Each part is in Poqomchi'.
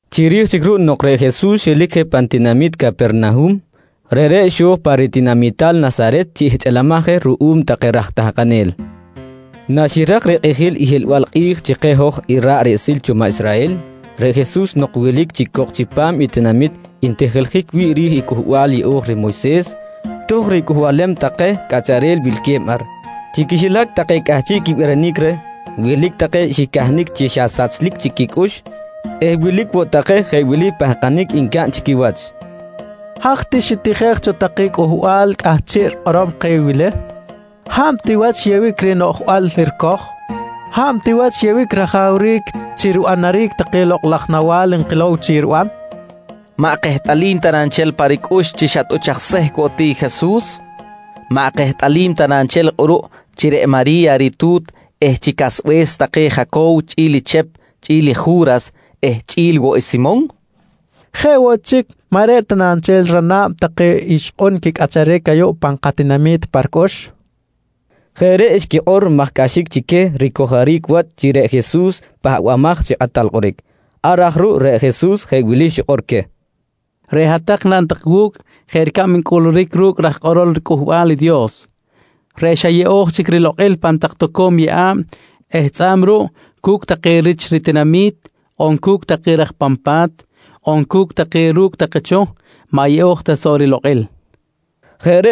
Chiri̱j chic ruꞌ nok reꞌ Jesus xelic je pan tinamit Capernahum, reꞌreꞌ xo̱j pa ritinamital Nasaret chi ihchꞌilimaj je ruꞌum take raj tahkanel. Naxirak rikꞌijil i hiꞌlbal kꞌi̱j chi keh i hoj ra̱ꞌ riꞌsil cho maꞌ Israhel, reꞌ Jesus nok wilic chic cok chipam i pa̱t ntijiljic wi̱ꞌ ri̱j i Cꞌuhbal Yeꞌo̱j reh Moyses, tohkꞌ ricꞌuhbalem take cꞌacharel wilque̱b ar. Chi quixilac take cꞌahchiꞌ quibirinic reh, wilic take xicahnic chi xa sachlic chic quicꞌux eh wilic woꞌ take jeꞌ wili pahkanic ncaꞌn chi quiwach: «Haj ti xitijej cho take cꞌuhbal cꞌahchiꞌ rikꞌorom keh wili? Hab ti wach xyeꞌbic reh noꞌjbal ricoj? Hab ti wach xyeꞌbic rajawric chi ribanaric take lokꞌ laj nawa̱l nkilow chi riban? Maꞌ kehtꞌalim ta na nchel pa ricꞌux chi xa tꞌuch aj sehc woꞌ ti i Jesus? Maꞌ kehtꞌalim ta na nchel kꞌuruꞌ chi reꞌ Mari̱ya i ritu̱t eh chi casbe̱s take Jaco̱wo chꞌi̱l Chep, chꞌi̱l Ju̱ras eh chꞌi̱l woꞌ i Simon? Jeꞌ woꞌ chic maꞌ reꞌ ta na nchel rana̱b take ixkꞌun quicꞌacharic ayuꞌ pan katinami̱t pa ricꞌux? nqui take pan quicꞌux. Jeꞌ reꞌ xquikꞌor maj cꞌaxic chi queh ricojoric wach chi reꞌ Jesus i Pahbamaj chi Kꞌatal Kꞌoric. Ar aj ruꞌ reꞌ Jesus jeꞌ wili xikꞌor queh: «Reꞌ hat-tak naꞌn tak wu̱cꞌ jeꞌ ricab ncꞌuluric ru̱cꞌ raj kꞌorol Cꞌuhbal i Dios reꞌ xa yeꞌo̱j chic cho rilokꞌil pan tak toco̱m yeꞌa̱b eh tzꞌa̱b ruꞌ cu̱cꞌ take rich ritinami̱t on cu̱cꞌ take raj pan pa̱t on cu̱cꞌ take ru̱cꞌ take cho, maꞌ yeꞌo̱j ta soꞌ rilokꞌil, nqui queh.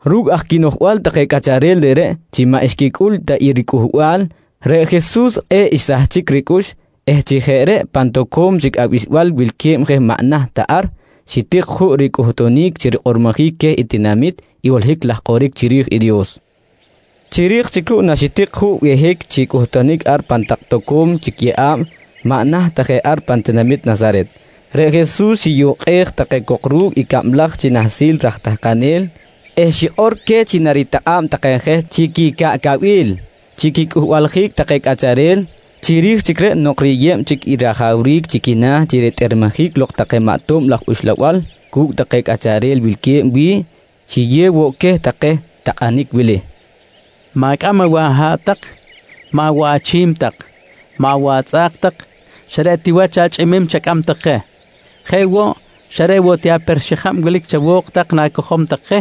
Ru̱cꞌ aj quinoꞌjbal take cꞌacharel reꞌreꞌ chi maꞌ xquicꞌul ta i riCꞌuhbal, reꞌ Jesus kꞌe̱ꞌ xsahchic ricꞌux eh chi jeꞌ reꞌ pan tak toco̱m chic abixbal wilque̱b je maꞌ naht ta ar, xitik juꞌ ricꞌuhtunic chi rikꞌormojic queh tinamit i holohic laj kꞌoric chiri̱j i Dios. Chiri̱j chic ruꞌ naxitik juꞌ behic chi cꞌuhtunic ar pan tak toco̱m chic yeꞌa̱b maꞌ naht ta je ar pan tinamit Nasaret, reꞌ Jesus xiyukꞌej take cok ru̱cꞌ i cablaj chi nahsil raj tahkanel eh xikꞌor queh chi naritakꞌa̱b take je chi quicaꞌcabil chi quicꞌuhbaljic take cꞌacharel. Chiri̱j chic reꞌ nok riyeb chic i rajawric chi quina̱ chi quitꞌermejic lok take maꞌ tob laj uxlabal cu̱cꞌ take cꞌacharel wilque̱b wi̱ꞌ, xiyew woꞌ queh take takꞌanic wili: «Ma̱cꞌam awaꞌ aha̱ꞌ tak. Maꞌ woꞌ achi̱m tak, maꞌ woꞌ atzꞌa̱k tak. Xa reꞌ ti wach achꞌimim chacꞌam tak je. Jeꞌ woꞌ, xa reꞌ woꞌ ti aper-xijab wilic chawo̱k tak na̱cojom tak je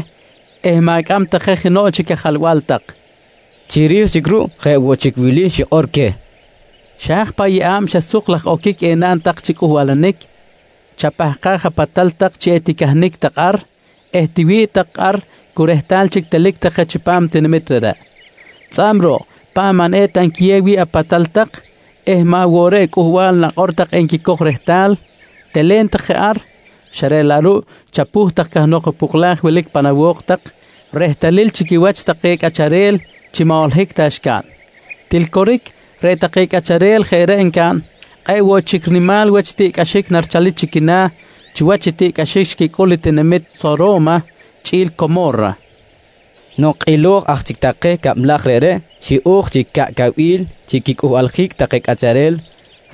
eh ma̱cꞌam tak je jenoꞌ chic ajalba̱l tak, nqui queh. Chiri̱j chic ruꞌ jeꞌ woꞌ chic wili xikꞌor queh: «Xa haj paꞌ yeꞌa̱b xa suk laj oquic enaꞌn tak chi cꞌuhbalanic, chapahkaj apatal tak chi eticahnic tak ar eh tiwi̱ꞌ tak ar cu rehtal chic telic tak je chipam i tinamit reꞌreꞌ. Tzꞌa̱b ruꞌ, paꞌ maꞌ eta nquiyew wi̱ꞌ apatal tak eh maꞌ woꞌ reꞌ cꞌuhbal nakꞌor tak enquicoj rehtal, telen tak je ar xa reꞌ laꞌ ruꞌ chapuh tak cahnok i poklaj wilic pan awo̱k tak rehtalil chi quiwach take cꞌacharel chi maꞌ holohic ta xcaꞌn. Til coric reꞌ take cꞌacharel jeꞌ reꞌ encaꞌn, kꞌe̱ꞌ woꞌ chic nimal wach i tiꞌcꞌaxic narichalic chi quina̱ chiwach i tiꞌcꞌaxic xicꞌul i tinamit Soro̱ma chꞌi̱l i Como̱ra, nqui Jesus. Nok kꞌilo̱j aj chic take cablaj reꞌreꞌ, xiꞌo̱j chi caꞌcabil chi quicꞌuhbaljic take cꞌacharel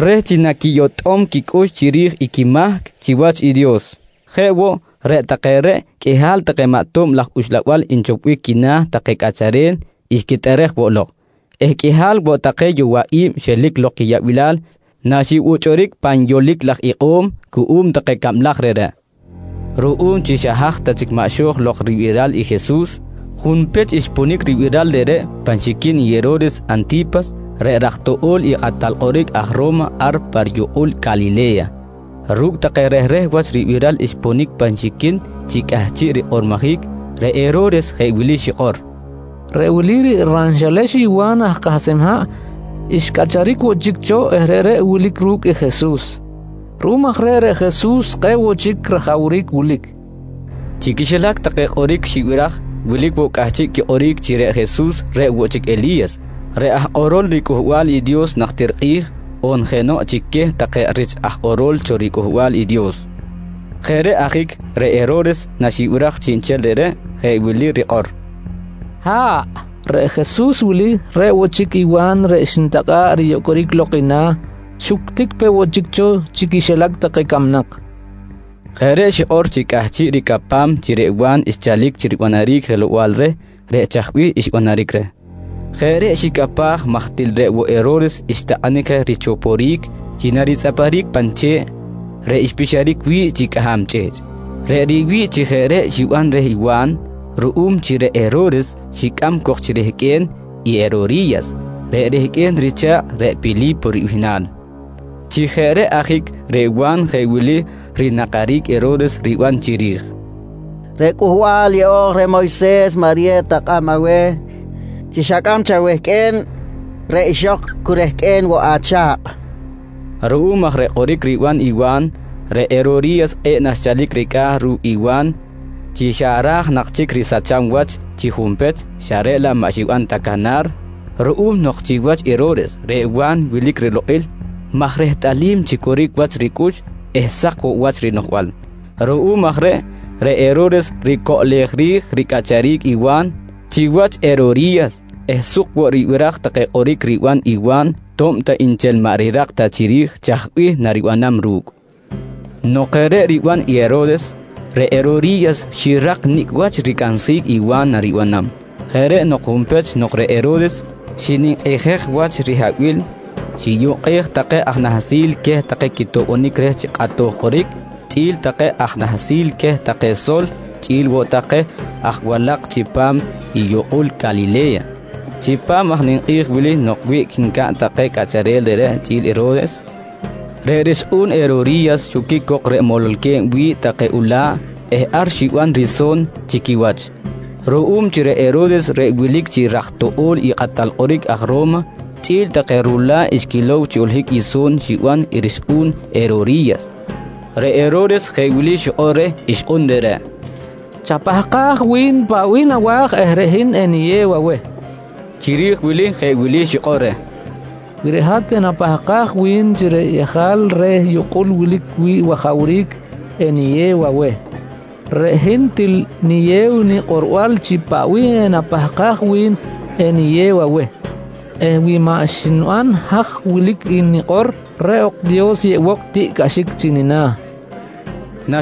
reh chi naquiyotꞌom quicꞌux chiri̱j i quimahc chiwach i Dios. Jeꞌ woꞌ, reꞌ take reꞌ qꞌuihal take maꞌ tob laj uxlabal nchopbic quina̱ take cꞌacharel xquitꞌerej woꞌ lok eh qꞌuihal woꞌ take yowaꞌi̱b xelic lok quiyaꞌbilal naxibuchꞌuric pan yolic laj ikꞌo̱m cuꞌum take cablaj reꞌreꞌ. Ruꞌum chi xa haj ta chic maꞌ xo̱j lok ribiral i Jesus, junpech xponic ribiral reꞌreꞌ pan xiquin i Hero̱res Anti̱pas, reꞌ raj toꞌo̱l i kꞌatal kꞌoric aj Ro̱ma ar pa riyukꞌul Calile̱ya. Ru̱cꞌ take rehreh wach ribiral xponic pan xiquin chi cꞌahchiꞌ rikꞌormojic, reꞌ Hero̱res jeꞌ wili xikꞌor: «Reꞌ wili reꞌ ranxelex i Wa̱n aj kahsem haꞌ xcꞌacharic woꞌ chic cho eh reꞌreꞌ wilic ru̱cꞌ i Jesus. Ruꞌum aj reꞌ, reꞌ Jesus kꞌe̱ꞌ woꞌ chic rajawric wilic, nqui xikꞌor. Chi quixilac take kꞌoric xibiraj, wilic woꞌ cꞌahchiꞌ quikꞌoric chi reꞌ Jesus reꞌ woꞌ chic i Eli̱yas reꞌ aj kꞌorol riCꞌuhbal i Dios najtir kꞌi̱j on jenoꞌ chic queh take rich aj kꞌorol cho riCꞌuhbal i Dios. Jeꞌ reꞌ ajic reꞌ Hero̱res naxibiraj chiꞌnchel reꞌreꞌ jeꞌ wili i rikꞌor: «Ha̱ꞌ, reꞌ Jesus wili reꞌ woꞌ chic i Wa̱n reꞌ xnitakꞌa̱ꞌ riyocꞌoric lok i na̱, xuctic peꞌ woꞌ chic cho chi quixilac take camnak, nqui xikꞌor. Jeꞌ reꞌ xikꞌor chi cꞌahchiꞌ ricapam chi reꞌ Wa̱n xchalic chi ribanaric jelow-bal reh reꞌ chaj bih xbanaric reh. Jeꞌ reꞌ xicapaj maj til reꞌ woꞌ Hero̱res xtakꞌanic je richoporic chi naritzꞌaparic pan che̱ꞌ reꞌ xpixaric wi̱ꞌ chi cꞌaham chꞌihchꞌ. Reꞌ riwi̱ꞌ chi jeꞌ reꞌ xiban reh Wa̱n ruꞌum chi reꞌ Hero̱res xicꞌam cok chi rehqꞌue̱n i Herori̱yas reꞌ rehqꞌue̱n richa̱kꞌ reꞌ Pili̱po ribihnal. Chi jeꞌ reꞌ ajic reꞌ Wa̱n jeꞌ wili rinakaric i Hero̱res riban chiri̱j: «Reꞌ Cꞌuhbal Yeꞌo̱j reh Moyses maꞌ riyew ta kꞌab aweh chi xacꞌam chi awehqꞌue̱n reꞌ ixok cu rehqꞌue̱n woꞌ acha̱kꞌ, nqui reh. Ruꞌum aj reh kꞌoric riban i Wa̱n, reꞌ Herori̱yas kꞌe̱ꞌ nanchalic ricꞌa̱ ru̱cꞌ i Wa̱n chi xa ra̱j nak chic risacham wach chi junpech xa reꞌ laꞌ maꞌ xiban ta canar ruꞌum nok chiwach i Hero̱res, reꞌ Wa̱n wilic rilokꞌil maj rehtꞌalim chi coric wach ricꞌux eh sak woꞌ wach rinoꞌjbal. Ruꞌum aj reꞌ, reꞌ Hero̱res ricoꞌlej ri̱j ricꞌacharic i Wa̱n chiwach i Herori̱yas eh suk woꞌ ribiraj take kꞌoric riban i Wa̱n to̱b ta nchel maꞌ rirak ta chiri̱j chaj bih naribanam ru̱cꞌ. Nok jeꞌ reꞌ riban i Hero̱res, reꞌ Herori̱yas xirak nicꞌ wach ricansjic i Wa̱n naribanam. Jeꞌ reꞌ nok junpech nok reꞌ Hero̱res xininkꞌijej wach rihabil xiyukꞌej take aj nahsil queh take quitoꞌbonic reh chi kꞌatoj kꞌoric chꞌi̱l take aj nahsil queh take sol chꞌi̱l woꞌ take aj walak chipam i yukꞌul Calile̱ya. Chipam aj i ninkꞌi̱j wili nok wiꞌc ncaꞌn take cꞌacharel reꞌreꞌ chꞌi̱l Hero̱res, reꞌ rixkꞌu̱n Herori̱yas xoquic cok reꞌ mololque̱b wi̱ꞌ take ula̱ꞌ eh ar xiban riso̱n chi quiwach. Ruꞌum chi reꞌ Hero̱res reꞌ wilic chi raj toꞌo̱l i kꞌatal kꞌoric aj Ro̱ma chꞌi̱l take rula̱ꞌ xquilow chi holohic i so̱n xiban i rixkꞌu̱n i Herori̱yas, reꞌ Hero̱res jeꞌ wili xikꞌor reh ixkꞌun reꞌreꞌ: «Chapahkaj wi̱n paꞌ bih nawa̱j eh reꞌ hin eniyew aweh, nqui reh. Chiri̱j wili jeꞌ wili xikꞌor reh: «Wi reꞌ hat enapahkaj wi̱n chi reꞌ yejal reh yukꞌul wilic wi̱ꞌ wajawric eniyew aweh, reꞌ hin til niyew nikꞌorbal chi paꞌ bih enapahkaj wi̱n eniyew aweh eh wi maꞌ xniban haj wilic i nikꞌor, reꞌ ok Dios yeꞌbok i tiꞌcꞌaxic chi nina̱, nqui reh.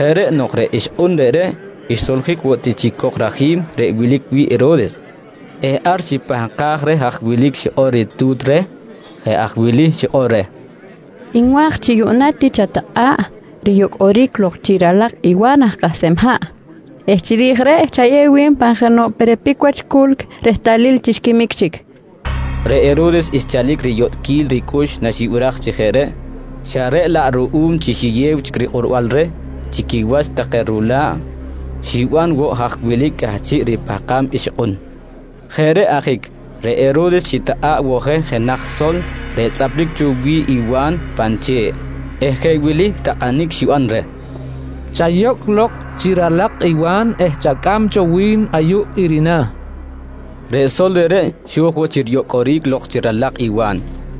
Jeꞌ reꞌ nok reꞌ ixkꞌun reꞌreꞌ xsoljic woꞌ ti chic cok rajim reꞌ wilic wi̱ꞌ Hero̱res eh ar xipahkaj reh haj wilic i xikꞌor ritu̱t reh. Jeꞌ aj wili xikꞌor reh: «Nwa̱j chi yuꞌna ti chatakꞌa̱ꞌ riyocꞌoric lok chi ralak i Wa̱n aj kahsem haꞌ eh chiri̱j reꞌ chayew wi̱n pan jenoꞌ perepic wach culc rehtalil chi xquimic chic, nqui reh. Reꞌ Hero̱res xchalic riyotꞌquil ricꞌux naxibiraj chi jeꞌ reꞌ, xa reꞌ laꞌ ruꞌum chi xiyew chic rikꞌorbal reh chi quiwach take rula̱ꞌ, xiban woꞌ haj wilic cꞌahchiꞌ ripahkam ixkꞌun. Jeꞌ reꞌ ajic reꞌ Hero̱res xitakꞌa̱ꞌ woꞌ je jenaj sol reꞌ tzꞌaplic cho wi̱ꞌ i Wa̱n pan che̱ꞌ eh jeꞌ wili takꞌanic xiban reh: «Chayocꞌ lok chi ralak i Wa̱n eh chacꞌam cho wi̱n ayuꞌ i rina̱, nqui reh. Reꞌ sol reꞌreꞌ xo̱j woꞌ chi riyocꞌoric lok chi ralak i Wa̱n.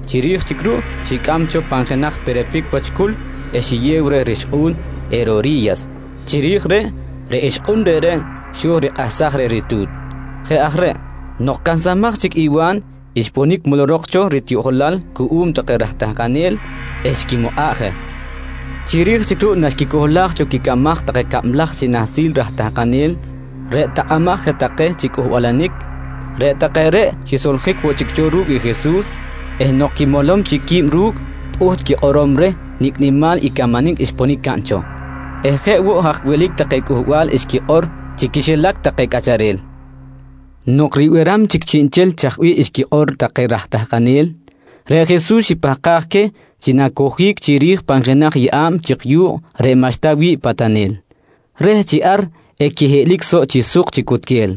Chiri̱j chic ruꞌ xicꞌam cho pan jenaj perepic wach culc eh xiyew reh rixkꞌu̱n i Herori̱yas. Chiri̱j reꞌ, reꞌ ixkꞌun reꞌreꞌ, xo̱j rikꞌahsaj reh ritu̱t. Jeꞌ aj reꞌ, nok cansamaj chic i Wa̱n xponic molorok cho ritiꞌjolal cuꞌum take raj tahkanel eh xquimukꞌa̱ꞌ je. Chiri̱j chic ruꞌ naxquicohlaj cho quicamaj take cablaj chi nahsil raj tahkanel reꞌ takꞌamaj take je chi cꞌuhbalanic, reꞌ take reꞌ xisoljic woꞌ chic cho ru̱cꞌ i Jesus eh nok quimolom chic qui̱b ru̱cꞌ, pꞌuht quikꞌorom reh nicꞌ nimal i camanic xponic caꞌn cho eh jeꞌ woꞌ haj wilic take cꞌuhbal xquikꞌor chi quixilac take cꞌacharel. Nok ribiram chic chiꞌnchel chaj bih xquikꞌor take raj tahkanel, reꞌ Jesus xipahkaj queh chi nacojic chiri̱j pan jenaj yeꞌa̱b chik yu̱kꞌ reꞌ maꞌxta wi̱ꞌ patanel reh chi ar equihiꞌlic soꞌ chi suk chi cutquel.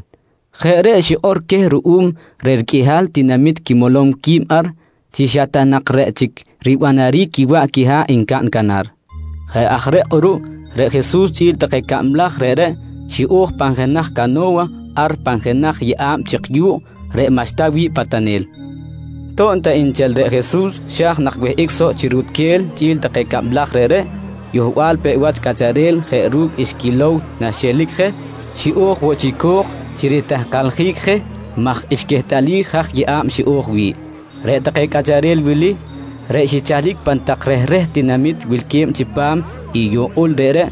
Jeꞌ reꞌ xikꞌor queh ruꞌum reh riqꞌuihal tinamit quimolom qui̱b ar chi xa ta nak reꞌ chic ribanaric i quiwaꞌ quiha̱ꞌ ncaꞌn canar. Jeꞌ aj reꞌ kꞌuruꞌ reꞌ Jesus chꞌi̱l take cablaj reꞌreꞌ xiꞌo̱j pan jenaj cano̱wa ar pan jenaj yeꞌa̱b chik yu̱kꞌ reꞌ maꞌxta wi̱ꞌ patanel. To̱b ta nchel reꞌ Jesus xa̱j nak wihꞌic soꞌ chi rutquel chꞌi̱l take cablaj reꞌreꞌ, yohbal peꞌ wach cꞌacharel jeꞌ ru̱cꞌ xquilow naxiꞌelic je, xiꞌo̱j woꞌ chi co̱k chi ritahkaljic je maj xquehtꞌalij haj yeꞌa̱b xiꞌo̱j wi̱ꞌ. Reꞌ take cꞌacharel wili reꞌ xichalic pan tak rehreh tinamit wilque̱b chipam i yukꞌul reꞌreꞌ,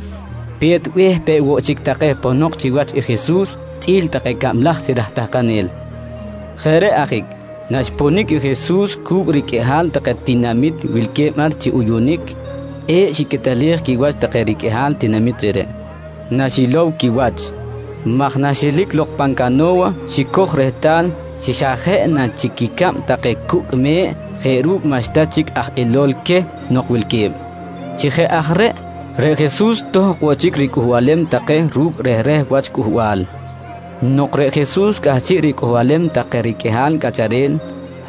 pe̱t be̱h peꞌ woꞌ chic take ponok chiwach i Jesus chꞌi̱l take cablaj chi raj tahkanel. Jeꞌ reꞌ ajic naxponic i Jesus cu̱cꞌ riqꞌuihal take tinamit wilque̱b ar chi uyunic, kꞌe̱ꞌ xiquetelej quiwach take riqꞌuihal tinamit reꞌreꞌ naxilow quiwach maj naxelic lok pan cano̱wa xicoj rehtal chi xa jeꞌ na chic quicab take cucꞌ me̱ꞌ jeꞌ ru̱cꞌ maꞌxta chic aj ilol queh nok wilque̱b. Chi jeꞌ aj reꞌ, reꞌ Jesus tohkꞌ woꞌ chic ricꞌuhbalem take ru̱cꞌ rehreh wach cꞌuhbal. Nok reꞌ Jesus cꞌahchiꞌ ricꞌuhbalem take riqꞌuihal cꞌacharel,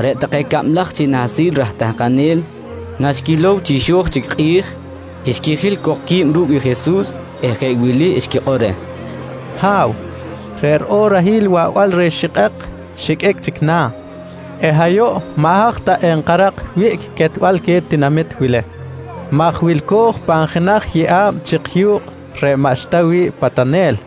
reꞌ take cablaj chi nahsil raj tahkanel naxquilow chi xo̱j chic i kꞌi̱j, xquijil cok qui̱b ru̱cꞌ i Jesus eh jeꞌ wili xquikꞌor reh: «Ha̱w, reꞌ riꞌorahil i waꞌbal reh xikꞌek xiqꞌuic chic na̱ eh ayuꞌ maꞌ haj ta enkarak wiꞌc quetbal queh tinamit wili maj wilco̱j pan jenaj yeꞌa̱b chik yu̱kꞌ reꞌ maꞌxta wi̱ꞌ patanel.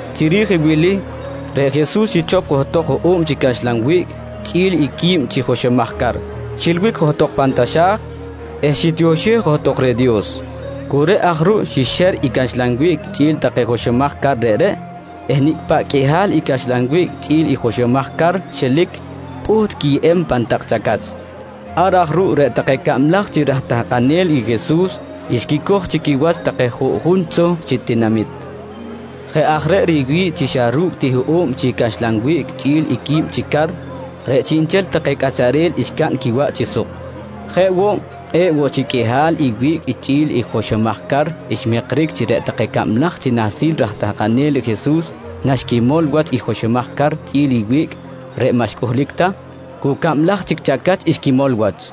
Chiri̱j i wili, reꞌ Jesus xichop johtok i hoꞌo̱b chi caxlan wiꞌc chꞌi̱l i quib chi joxomaj car, xilbic johtok pan taxa̱j eh xitioxej johtok reh Dios. Cu reꞌ aj ruꞌ xixer i caxlan wiꞌc chꞌi̱l take joxomaj car reꞌreꞌ eh nicꞌ paꞌ qꞌuihal i caxlan wiꞌc chꞌi̱l i joxomaj car xelic, pꞌuht quiyeb pan tak chacach. Ar aj ruꞌ reꞌ take cablaj chi raj tahkanel i Jesus xquicoj chi quiwach take juꞌjun tzohk chi tinamit. Jeꞌ aj reꞌ riwi̱ꞌ chi xa ru̱cꞌ ti hoꞌo̱b chi caxlan wiꞌc chꞌi̱l i quib chi car, reꞌ chiꞌnchel take cꞌacharel xcaꞌn quiwaꞌ chi suk. Jeꞌ woꞌ, kꞌe̱ꞌ woꞌ chic qꞌuihal i wiꞌc chꞌi̱l i joxomaj car xmikric chi reꞌ take cablaj chi nahsil raj tahkanel i Jesus naxquimol wach i joxomaj car chꞌi̱l i wiꞌc reꞌ maꞌ xcꞌuhlic ta, cu cablaj chic chacach xquimol wach.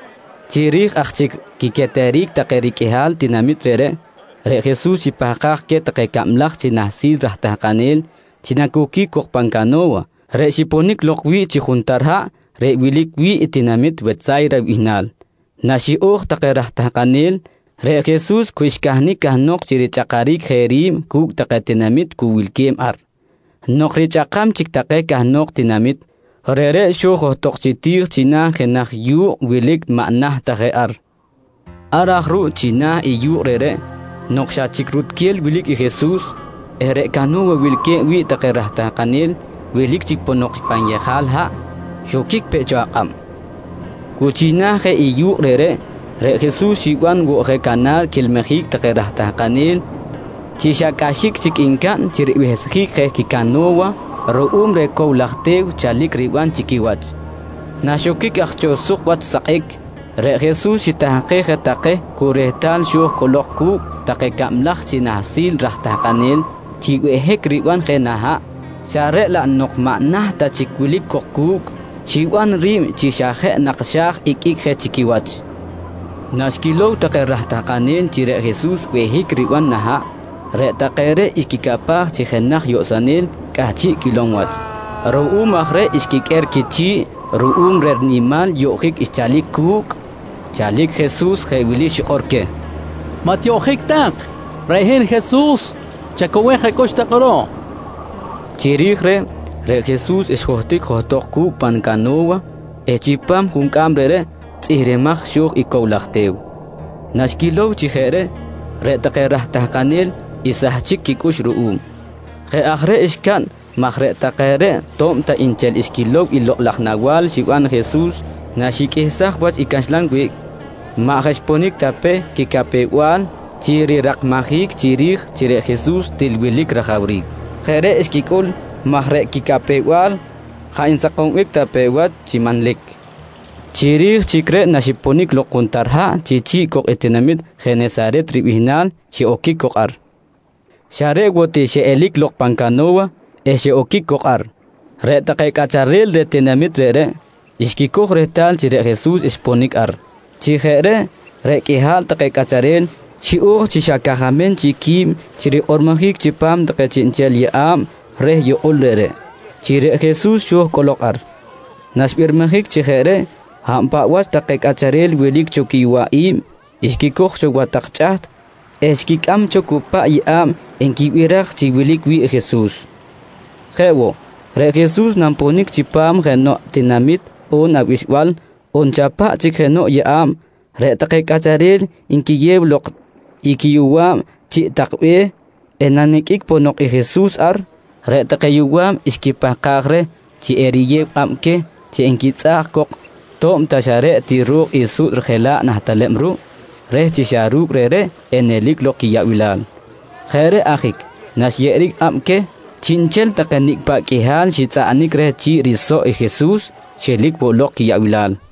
Chiri̱j aj chic quiqueteric take riqꞌuihal tinamit reꞌreꞌ, reꞌ Jesus xipahkaj queh take cablaj chi nahsil raj tahkanel chi nacoquic cok pan cano̱wa reꞌ xiponic lok wi̱ꞌ chi juntar haꞌ reꞌ wilic wi̱ꞌ i tinamit Wetsa̱yra ribihnal. Naxiꞌo̱j take raj tahkanel, reꞌ Jesus cu xcahnic cahnok chi richꞌakaric je ri̱b cu̱cꞌ take tinamit cu wilque̱b ar. Nok richꞌakam chic take cahnok tinamit, reꞌreꞌ xo̱j johtok chi ti̱j china̱ i jenaj yu̱kꞌ wilic maꞌ naht ta je ar. Ar aj ruꞌ china̱ i yu̱kꞌ reꞌreꞌ, nok xa chic rutquel wilic i Jesus eh reꞌ cano̱wa wilque̱b wi̱ꞌ take raj tahkanel wilic chic ponok pan yejal haꞌ, xoquic peꞌ cho akꞌab. Cu china̱ je i yu̱kꞌ reꞌreꞌ, reꞌ Jesus xiban woꞌ je canar quilmijic take raj tahkanel chi xa cꞌaxic chic ncaꞌn chi ribehsjic je quicano̱wa ruꞌum reh cow laj te̱w chalic riban chi quiwach. Naxoquic aj cho suk wach sakꞌic, reꞌ Jesus xitahkej je take cu rehtal xo̱j cꞌolok cu̱cꞌ take cablaj chi nahsil raj tahkanel chi behic riban je nah haꞌ xa reꞌ laꞌ nok maꞌ naht ta chic wilic cok cu̱cꞌ, xiban ri̱b chi jeꞌ nak xa̱j iqꞌuic je chi quiwach. Naxquilow take raj tahkanel chi reꞌ Jesus behic riban nah haꞌ, reꞌ take reꞌ xquicapaj chi jenaj yoꞌsonel cꞌahchiꞌ quilom wach. Ruꞌum aj reꞌ xquiqꞌuer quichi̱ꞌ ruꞌum reh rinimal yoꞌjic xchalic cu̱cꞌ. Chalic Jesus, jeꞌ wili xikꞌor queh: «Maꞌ tiyoꞌjic tak, reꞌ hin Jesus. Chacowej acꞌux tak kꞌuruꞌ, nqui queh. Chiri̱j reꞌ, reꞌ Jesus xjohtic johtok cu̱cꞌ pan cano̱wa eh chipam i juncꞌam reꞌreꞌ, tzꞌihrimaj xo̱j i cow laj te̱w. Naxquilow chi jeꞌ reꞌ, reꞌ take raj tahkanel xsahchic quicꞌux ruꞌum. Jeꞌ aj reꞌ xcaꞌn maj reꞌ take reꞌ to̱b ta nchel xquilow i lokꞌ laj nawa̱l xiban i Jesus naxiqꞌuihsaj wach i caxlan wiꞌc, maꞌ jaꞌ xponic ta pe quicapew-bal chi rirakmajic chiri̱j chi reꞌ Jesus til wilic rajawric. Jeꞌ reꞌ xquicꞌul maj reꞌ quicapew-bal jaꞌ nsakombic ta pe wach chi manlic. Chiri̱j chic reꞌ naxiponic lok juntar haꞌ chi chi̱ꞌ cok i tinamit Jenesaret ribihnal, xiꞌoquic cok ar. Xa reꞌ woꞌ ti xiꞌelic lok pan cano̱wa eh xiꞌoquic cok ar, reꞌ take cꞌacharel reh tinamit reꞌreꞌ xquicoj rehtal chi reꞌ Jesus xponic ar. Chi jeꞌ reꞌ, reꞌ qꞌuihal take cꞌacharel xiꞌo̱j chi xa cajamem chic qui̱b chi rikꞌormojic chipam take chiꞌnchel yeꞌa̱b reh yukꞌul reꞌreꞌ chi reꞌ Jesus xo̱j cꞌolok ar. Naxbirmijic chi jeꞌ reꞌ, hab paꞌ wach take cꞌacharel wilic cho quiyowaꞌi̱b, xquicoj cho wa tak chꞌaht eh xquicꞌam cho cu paꞌ yeꞌa̱b nquibiraj chi wilic wi̱ꞌ i Jesus. Jeꞌ woꞌ, reꞌ Jesus nanponic chipam jenoꞌ tinamit on abixbal on xa paꞌ chic jenoꞌ yeꞌa̱b, reꞌ take cꞌacharel nquiyew lok i quiyowa̱b chiꞌ tak be̱h eh naniqꞌuic ponok i Jesus ar, reꞌ take yowa̱b xquipahkaj reh chi eriyew kꞌab queh chi enquitzꞌaꞌj cok to̱b ta xa reꞌ ti ro̱k i suꞌt rijela̱ꞌ nah teleb ruꞌ, reh chi xa ru̱cꞌ reꞌreꞌ enelic lok i quiyaꞌbilal. Jeꞌ reꞌ ajic naxyeꞌeric kꞌab queh, chiꞌnchel take nicꞌ paꞌ qꞌuihal xitzꞌaꞌnic reh chi̱ꞌ risoꞌ i Jesus xelic woꞌ lok quiyaꞌbilal.